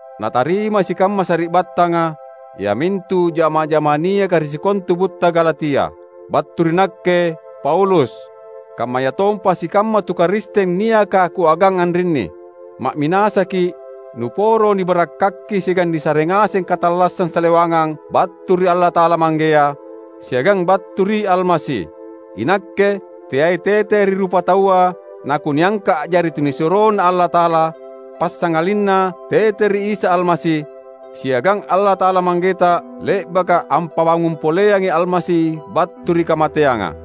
Natarimai sikamma sari’battanga, iamintu jama’ah-jama’ah niaka ri sikontu butta Galatia. Battu ri nakke Paulus kammayatompa sikamma tu Karisteng niaka kuagang anrinni; ma’minasaki’ nuporo nibarakkaki siagang nisare ngaseng katallassang salewangang battu ri Allata’ala Manggea, siagang battu ri Almasi. Inakke, teai tete ri rupataua nakuniangka’ a’jari tunisuroNa Allata’ala; passangalinna tete ri Isa Almasi, siagang Allata’ala Manggeta le’baka ampabangung poleangi Almasi battu ri kamateanga.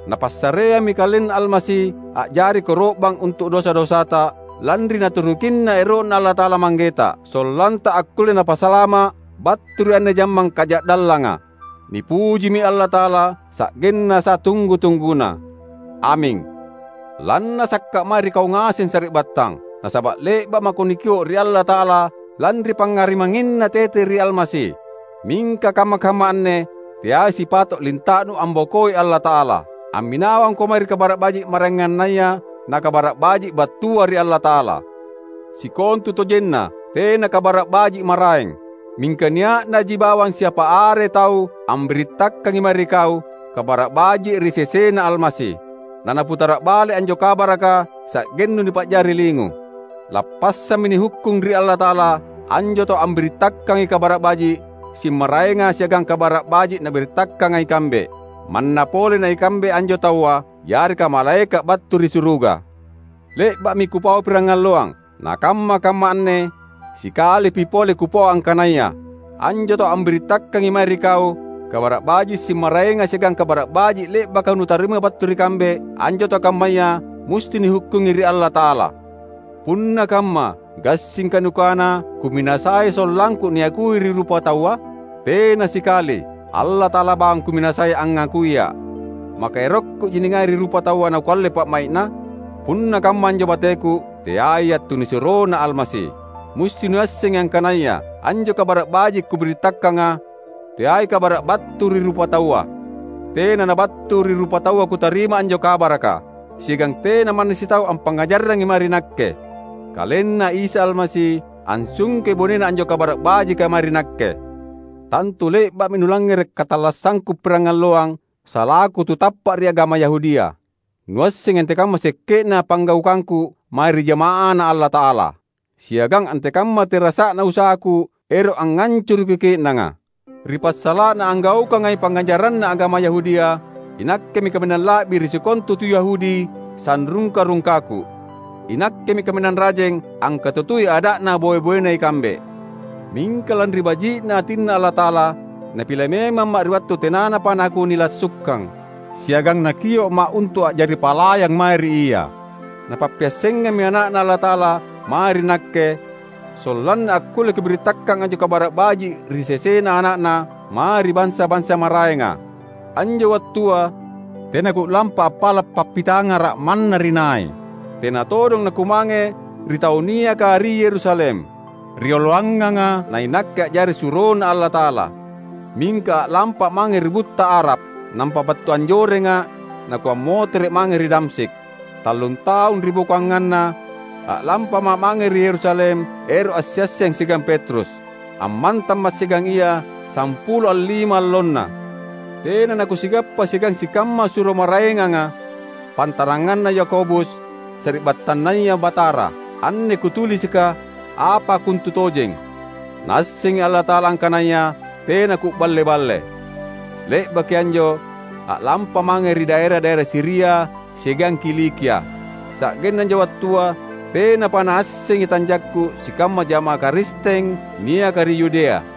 Napassareammi KalenNa Almasi a’jari koro’bang untu’ dosa-dosata, lanri Naturukinna ero’Na Allata’ala Manggeta. Sollanta akkulle nipasalama’ battu ri anne jammang kaja’dallanga. Nipujimi Allata’ala sa’genna satunggu-tungguna. Aming. Lannasaka’ mae ri kau ngaseng sari’battang! Nasaba’ le’ba’ mako nikio’ ri Allata’ala lanri pangngarimangnginNa tete ri Almasi. Mingka kamma-kamma anne teai sipato’ linta’nu ambokoi Allata’ala. Amminawangko mae ri "kabara’ baji’" maraengannaya na Kabara’ Baji’ battua ri Allata’ala. Sikontutojenna tena "kabara’ baji’ maraeng". Mingka nia’naji bawang siapa are tau ambirittakangi mae ri kau "kabara’ baji’" ri sesena Almasi, nanaputara’ bale’ anjo kabaraka sa’gennu nipa’jari lingu. Lappassammi nihukkung ri Allata’ala anjo tau ambirittakangai "kabara’ baji’" simmaraenga siagang Kabara’ Baji’ nabirittakanga ikambe. Manna pole na ikambe anjo taua, yareka malaeka’ battu ri suruga! Le’ba’mi kupau pirangalloang, nakamma-kamma anne sikalipi pole kupau angkanaya: Anjo tau ambirittakangai mae ri kau "kabara’ baji’" simmaraenga siagang Kabara’ Baji’ le’baka nutarima battu ri kambe, anjo tau kammaya musti nihukkungi ri Allata’ala! Punna kamma, gassingka nukana kuminasai sollangku niakui ri rupataua? Tena sikali! Allata’ala bawang kuminasai angngakuia’. Maka erokkuji ningai ri rupataua nakualle pa’mai’na? Punna kamma anjo bateku, teaiya’ tunisuroNa Almasi. Musti nuassengi angkanaya anjo Kabara’ Baji’ kubirittakanga, teai kabara’ battu ri rupataua. Tena nabattu ri rupataua kutarima anjo kabaraka. Siagang tena manna sitau ampangngajarrangi mae ri nakke. KalenNa Isa Almasi ansungkei bonena anjo Kabara’ Bajika mae ri nakke. Tantu le’ba’mi nulangngere’ katallassangku pirangalloang salaku tu tappa’ ri agama Yahudia. Nuassengi antekamma sekke’na panggaukangku mae ri jama’aNa Allata’ala. Siagang antekamma terasa’na usahaku ero’ angngancuruki ke’nanga. Ri passala’na anggaukangai pangngajaranna agama Yahudia, inakkemi kaminang la’bi ri sikontu tu Yahudi sanrungka-rungkaku. Inakkemi kaminang rajeng angkatutui ada’na boe-boena ikambe. Mingka lanri baji’ atiNa Allata’ala, Napile memamma’ ri wattu tenanapa nakunilassukang. Siagang Nakio’ma’ untu’ a’jari palayang mae ri Ia. Napappiassengammi Ana’Na Allata’ala mae ri nakke; sollanna akkulle kubirittakang anjo Kabara’ Baji’ ri sesena Ana’Na, mae ri bansa-bansa maraenga. Anjo wattua tena ku’lampa appala’ pappitangara’ manna ri nai. Tena todong nakumange ri tau niaka ri Yerusalem, rioloanganga na inakke a’jari suroNa Allata’ala. Mingka a’lampa’ mange ri butta Arab, nampa battu anjorenga’ nakuammotere’ mange ri Damsyik. Tallun taung ribokoanganna, a’lampama’ mange ri Yerusalem, ero’ assiasseng siagang Petrus. Ammantamma’ siagang ia sampulo allima allonna. Tena nakusigappa siagang sikamma suro maraenganga, pantaranganna Yakobus, sari’battanNaya Batara. Anne kutulisika apa kontutojeng. Naassengi Allata’ala angkanaya tena ku’balle-balle! Le’baki anjo a’lampa’ mange ri daera-daera Siria siagang Kilikia. Sa’genna anjo wattua tenapa naassengi tanjakku sikamma jama’ah Karisteng niaka ri Yudea.